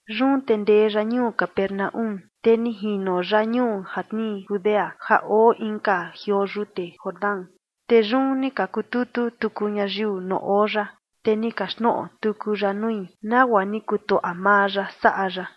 Yun te ni ndee ya ñuu Capernaúm, te ni jino ya ñuu ja tnii Judea ja oo inka jioo yute Jordán. Te yun ni ka kututu tuku ñayiu nuu oo ya, te ni kaxtnoꞌo tuku ya nui, nagua ni kutuaꞌa maa ya saꞌa ya.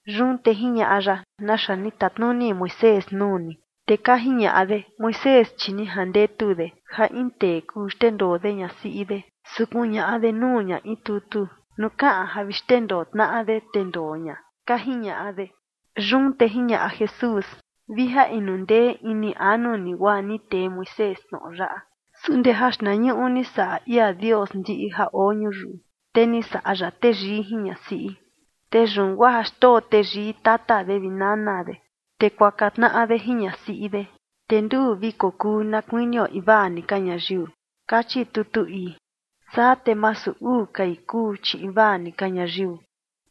Yun te jiñaꞌa ya: ―¿Naxa ni tatnuni Moisés nuu ni? Te ka jiñaꞌa de: ―Moisés, chi ni jandetu de ja in tee kuu xndendoo de ñasiꞌi de, su kuñaꞌa de nuu ña in tutu nuu kaꞌan ja vi xndendoo tnaꞌa de, te ndoo ña ―ka jiñaꞌa de. Yun te jiñaꞌa Jesús: ―Vi ja inu ndee ini anu ni guaa ni tee Moisés tnoꞌo yaꞌa. Su ndee jaxtnañuꞌu, ni saꞌa ia Dios ndiꞌi ja oo ñuyiu, te “ni saꞌa ya teyii jin ñasiꞌi. Te yun guaa xndoo teyii tata de vi nana de, te kuaka tnaꞌa de jin ñasiꞌi de. Te nduu vi kokuu na kuinio invaa ni ka ñayiu”, kachi tutu ii. Saa te masu uu kai kuu, chi invaa ni ka ñayiu.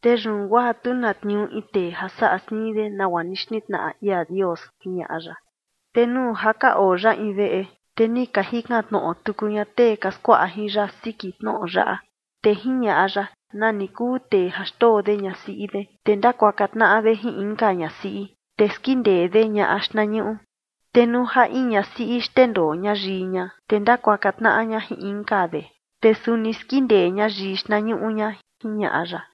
Te yun guaa tu na tniuu in tee ja saꞌa siin de nagua ni xtnitnaꞌa ia Dios ―jiñaꞌa ya. Te nuu ja ka oo ya in veꞌe, te ni ka jikan tnoꞌo tuku ña tee ka skuaꞌa jin ya siki tnoꞌo yaꞌa. Te jiñaꞌa ya: ―Nani kuu tee ja xndoo de ñasiꞌi de, te ndakuaka tnaꞌa de jin inka ñasiꞌi, te skindee de ñaꞌa xtnañuꞌu. Te nuu ja in ñasiꞌi xndendoo ña yii ña, te ndakuaka tnaꞌa ña jin inka de, te suni skindee ña yii xtnañuꞌu ña ―jiñaꞌa ya.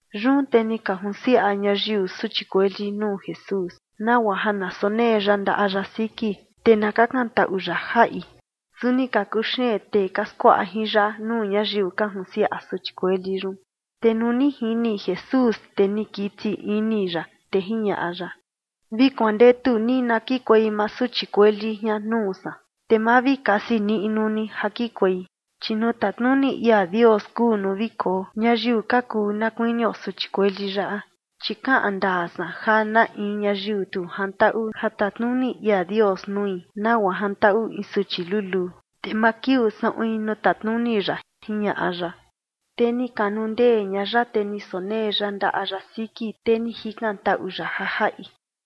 Yun te ni ka junsiaꞌa ñayiu suchi kueli nuu Jesús, nagua ja na sonee ya ndaꞌa ya siki, te na kakantaꞌu ya jaꞌi. Su ni ka kuxeen tee ka skuaꞌa jin ya nuu ñayiu ka junsiaꞌa suchi kueli yun. Te nuu ni jini Jesús, te ni kiti ini ya, te jiñaꞌa ya: ―Vi kuandetu ni na kikuei maa suchi kueli jian nuu san, te ma vi kasi niꞌnu ni ja kikuei, chi nuu tatnuni ia Dios kuu nuu vi koo ñayiu ka kuu na kuinio suchi kueli yaꞌa. Chi kaꞌan ndaa san ja na in ñayiu tu jantaꞌu ja tatnuni ia Dios nui nagua jantaꞌu in suchi luluu, te ma kiuu saꞌuin nuu tatnuni ya ―jiñaꞌa ya. Te ni kanundee ña ya vi ni sonee ya ndaꞌa ya siki, te ni jikantaꞌu ya ja jaꞌi.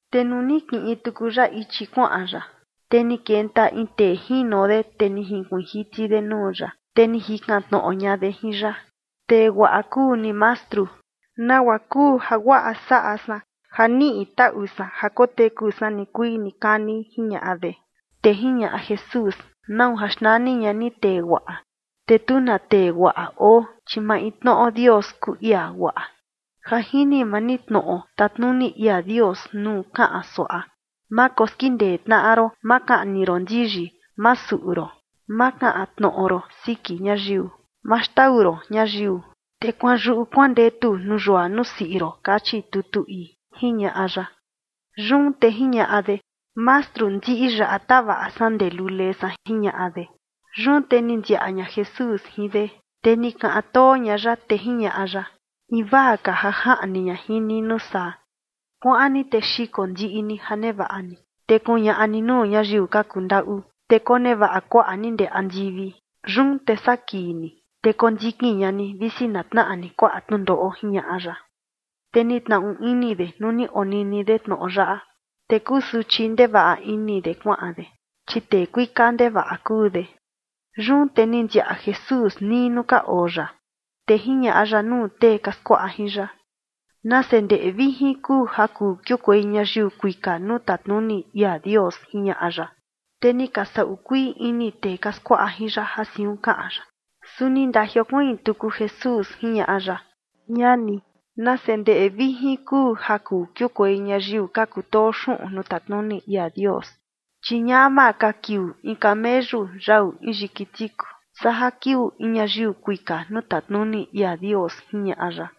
Te nuu ni kiꞌin tuku ya ichi kuaꞌan ya, te ni kenta in tee jino de, te ni jinkuiin jiti de nuu ya, te ni jikan tnoꞌo ña de jin ya: ―Tee guaꞌa kuu ni, Mastru. ¿Nagua kuu jaguaꞌa saꞌa san ja niꞌi taꞌu san ja koteku san nikuii nikani? ―jiñaꞌa de. Te jiñaꞌa Jesús: ―¿Nau ja xnani ña ni tee guaꞌa? Te tu na tee guaꞌa oo, chi maintnoꞌo Dios kuu ia guaꞌa. Ja jini maa ni tnoꞌo tatnuni ia Dios nuu kaꞌan suaꞌa: “Ma koskindee tnaꞌa ron, ma kaꞌni ron ndiyi, ma suꞌu ron, ma kaꞌan tnoꞌo ron siki ñayiu, ma xndaꞌu ron ñayiu, te kuanyuꞌu kuandetu nuu yua nuu siꞌi ron”, kachi tutu ii ―jiñaꞌa ya. Yun te jiñaꞌa de: ―Mastru, ndiꞌi yaꞌa tavaꞌa san ndee lule san ―jiñaꞌa de. Yun te ni ndiaꞌa ña Jesús jin de, te ni kaꞌan too ña ya, te jiñaꞌa ya: ―Invaa ka ja jaꞌni ña jin ni nuu saa: kuaꞌan ni te xiko ndiꞌi ni ja nevaꞌa ni, te kuñaꞌa ni nuu ñayiu ka kundaꞌu, te konevaꞌa kuaꞌa ni ndee andivi. Yun te saa kii ni, te kondikin ña ni visi na tnaꞌa ni kuaꞌa tnundoꞌo ―jiñaꞌa ya. Te ni tnaꞌu ini de nuu ni onini de tnoꞌo yaꞌa, te kusuchi ndevaꞌa ini de kuaꞌan de, chi tee kuika ndevaꞌa kuu de. Yun te ni ndiaꞌa Jesús nii nuu ka oo ya, te jiñaꞌa ya nuu tee ka skuaꞌa jin ya: ―Nase ndeꞌe vijin kuu ja kuu kiukuei ñayiu kuika nuu tatnuni ia Dios ―jiñaꞌa ya. Te ni ka saꞌu kuii ini tee ka skuaꞌa jin ya ja siun kaꞌan ya. Su ni ndajiokuiin tuku Jesús jiñaꞌa ya: ―Ñani, nase ndeꞌe vijin kuu ja kuu kiukuei ñayiu ka kutoo xuꞌun nuu tatnuni ia Dios. Chi ñama ka kiuu in kameyu yau in yiki tiku saa ja kiuu in ñayiu kuika nuu tatnuni ia Dios ―jiñaꞌa ya.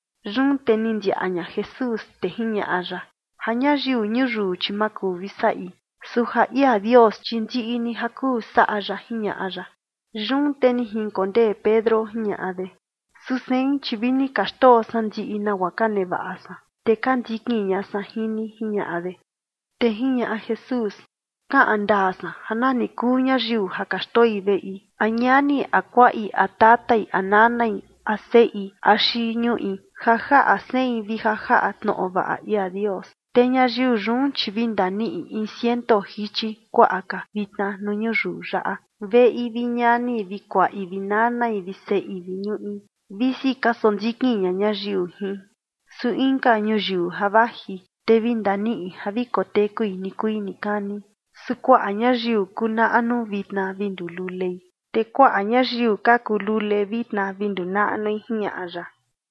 Yun te ni ndiaꞌa ña Jesús, te jiñaꞌa ya: ―Ja ñayiu ñuyiu, chi ma kuu vi saꞌi, su ja ia Dios, chi ndiꞌi ni ja kuu saꞌa ya ―jiñaꞌa ya. Yun te ni jinkondee Pedro jiñaꞌa de: ―Su sein, chi vi ni ka xndoo san ndiꞌi nagua ka nevaꞌa san, te ka ndikin ña san jin ni ―jiñaꞌa de. Te jiñaꞌa Jesús: ―Kaꞌan ndaa san ja nani kuu ñayiu ja ka xndoi veꞌe a ñani a kuaꞌi a tatai a nanai a seꞌi axi ñuꞌi ja jaꞌa sein vi ja jaꞌa tnoꞌo vaꞌa ia Dios, te ñayiu yun, chi vi ndaniꞌi in ciento jichi kuaꞌa ka vitna nuu ñuyiu yaꞌa: veꞌi vi ñani vi kuaꞌi vi nanai vi seꞌi vi ñuꞌi, visi ka sondikin ña ñayiu jin. Su inka ñuyiu ja vaji, te vi ndaniꞌi ja vi kotekui nikuii nikani. Su kuaꞌa ñayiu kuu naꞌnu vitna vi nduu lulei, te kuaꞌa ñayiu ka kuu lule vitna vi nduu naꞌnui ―jiñaꞌa ya.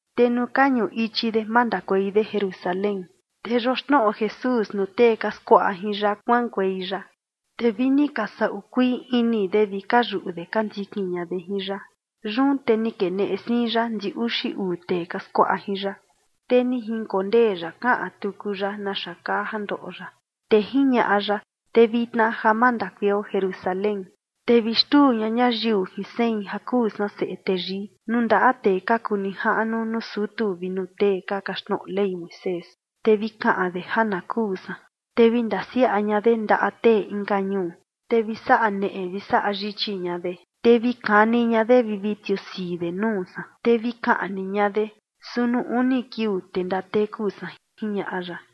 Te nuu ka ñuꞌu ichi de mandakuei de Jerusalén, te yoxnoꞌo Jesús nuu tee ka skuaꞌa jin ya kuaꞌankuei ya. Te vi ni ka saꞌu kuii ini de vi ka yuꞌu de ka ndikin ña de jin ya. Yun te ni keneꞌe siin ya ndi uxi uu tee ka skuaꞌa jin ya, te ni jinkondee ya kaꞌan tuku ya naxa kaa ja ndoꞌo ya. Te jiñaꞌa ya: ―Te vitna ja mandakueio Jerusalén, te vi xtuu ña ñayiu jin sein ja kuu san Seꞌe Teyii, nuu ndaꞌa tee ka kuu nijaꞌnu nuu sutu vi nuu tee ka kaxtnoꞌo Ley Moisés, te vi kaꞌan de ja na kuu san, te vi ndasiaꞌa ña de ndaꞌa tee inka ñuu, te vi saꞌa neꞌe vi saꞌa yichi ña de, te vi kani ña de vi vi tiusii de nuu san, te vi kaꞌni ña de. Su nuu uni kiuu, te ndateku san ―jiñaꞌa ya.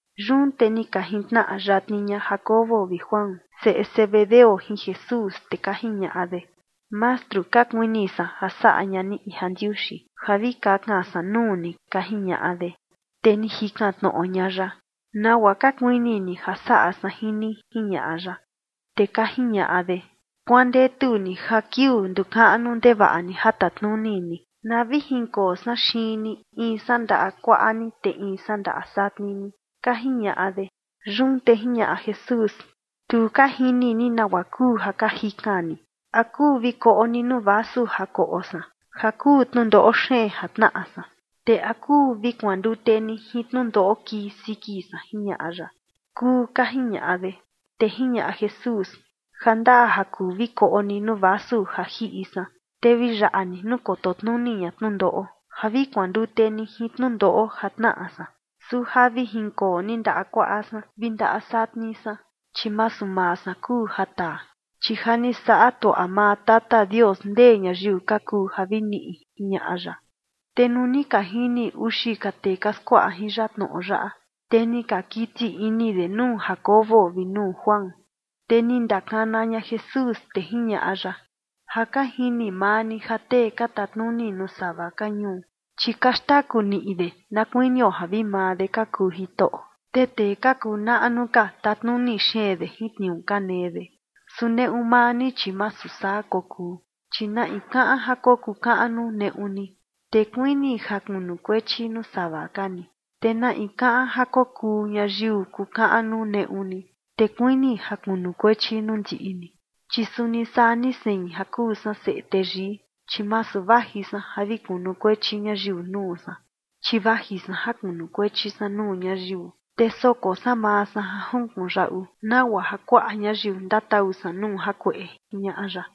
Yun te ni ka jintnaꞌa yatni ña Jacobo vi Juan, seꞌe Zebedeo, jin Jesús, te ka jiñaꞌa de: ―Mastru, ka kuini san ja saꞌa ña ni in jandiuxi ja vi kakan san nuu ni ―ka jiñaꞌa de. Te ni jikan tnoꞌo ña ya: ―¿Nagua ka kuini ni ja saꞌa san jin ni? ―jiñaꞌa ya. Te ka jiñaꞌa de: ―Kuandetu ni ja kiuu nduu kaꞌnu ndevaꞌa ni ja tatnuni ni, na vi jinkoo san xiin ni, in san ndaꞌa kuaꞌa ni, te inka san ndaꞌa satni ni ―ka jiñaꞌa de. Yun te jiñaꞌa Jesús: ―Tu ka jini ni nagua kuu ja ka jikan ni. ¿A kuu vi koꞌo ni nuu vasu ja koꞌo san ja kuu tnundoꞌo xeen ja tnaꞌa san? Te ¿a kuu vi kuandute ni jin tnundoꞌo kii siki san? ―jiñaꞌa ya. ―Kuu ―ka jiñaꞌa de. Te jiñaꞌa Jesús: ―Ja ndaa ja kuu vi koꞌo ni nuu vasu ja jiꞌi san, te vi yaꞌa ni nuu koto tnuni ña tnundoꞌo ja vi kuandute ni jin tnundoꞌo ja tnaꞌa san. Su ja vi jinkoo ni ndaꞌa kuaꞌa san vi ndaꞌa satni san, chi masu maa san kuu ja taa, chi ja ni saꞌa tuaꞌa maa Tata Dios ndee ñayiu ka kuu ja vi niꞌi ―jiñaꞌa ya. Te nuu ni ka jini uxi ka tee ka skuaꞌa jin ya tnoꞌo yaꞌa, te ni ka kiti ini de nuu Jacobo vi nuu Juan. Te ni ndakana ña Jesús, te jiñaꞌa ya: ―Ja ka jini maa ni ja tee ka tatnuni nuu sava ka ñuu, chi ka xtaku niꞌi de na kuinio ja vi maa de ka kuu jitoꞌo. Te tee ka kuu naꞌnu ka tatnuni xeen de jin tniuu ka nee de. Su neꞌu maa ni, chi masu saa kokuu, chi na in kaꞌan ja kokuu kaꞌnu neꞌu ni, te kuini ja kunukuechi nuu sava ka ni. Te na in kaꞌan ja kokuu ñayiu kukaꞌnu neꞌu ni, te kuini ja kunukuechi nuu ndiꞌi ni. Chi suni saa ni sein ja kuu san Seꞌe Teyii, chi masu vaji san ja vi kunukuechi ñayiu nuu san, chi vaji san ja kunukuechi san nuu ñayiu, te soko san maa san ja junkuꞌun yaꞌu, nagua ja kuaꞌa ñayiu ndatau san nuu jakueꞌe ―jiñaꞌa ya.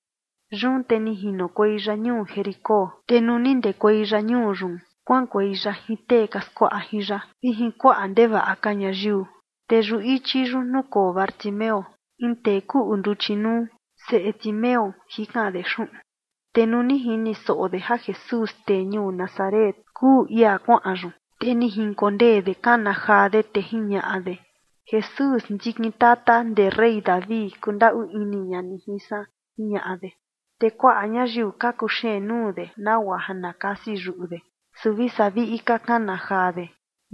Yun te ni jinokuei ya ñuu Jericó. Te nuu ni ndekuei ya ñuu yun kuaꞌankuei ya jin tee ka skuaꞌa jin ya vi jin kuaꞌa ndevaꞌa ka ñayiu. Te yuꞌu ichi yun nukoo Bartimeo, in tee kuꞌu nduchi nuu, seꞌe Timeo, jikan de xuꞌun. Te nuu ni jini soꞌo de ja Jesús, tee ñuu Nazaret, kuu ia kuaꞌan yun, te ni jinkondee de kana jaa de, te jiñaꞌa de: ―Jesús, ndikin tata ndee rey David, kundaꞌu ini ña ni jin san ―jiñaꞌa de. Te kuaꞌa ñayiu ka kuxeen nuu de nagua ja na kasi yuꞌu de, su vi saa viꞌi ka kana jaa de: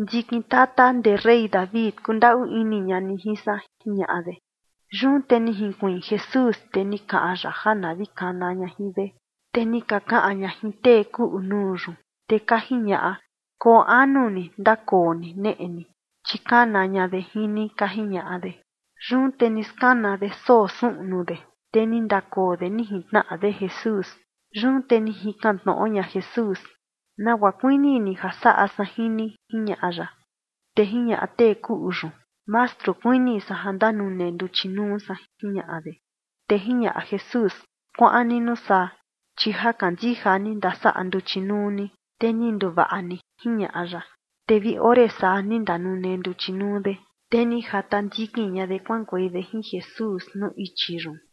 ―Ndikin tata ndee rey David, kundaꞌu ini ña ni jin san ―jiñaꞌa de. Yun te ni jinkuiin Jesús, te ni kaꞌan ya ja na vi kana ña jin de. Te ni ka kaꞌan ña jin tee kuꞌu nuu yun, te ka jiñaꞌa: ―Koo anu ni, te ndakoo ni neꞌe ni, chi kana ña de jin ni ―ka jiñaꞌa de. Yun te ni skana de soo suꞌnu de, te ni ndakoo de ni jintnaꞌa de Jesús. Yun te ni jikan tnoꞌo ña Jesús: ―¿Nagua kuini ni ja saꞌa san jin ni? ―jiñaꞌa ya. Te jiñaꞌa tee kuꞌu yun: ―Mastru, kuini san ja ndanune nduchi nuu san ―jiñaꞌa de. Te jiñaꞌa Jesús: ―Kuaꞌan ni nuu saa, chi ja kandija ni, ndasaꞌa nduchi nuu ni, te ni nduvaꞌa ni ―jiñaꞌa ya. Te vi ore saa ni ndanune nduchi nuu de, te ni jata ndikin ña de kuaꞌankuei de jin Jesús nuu ichi yun.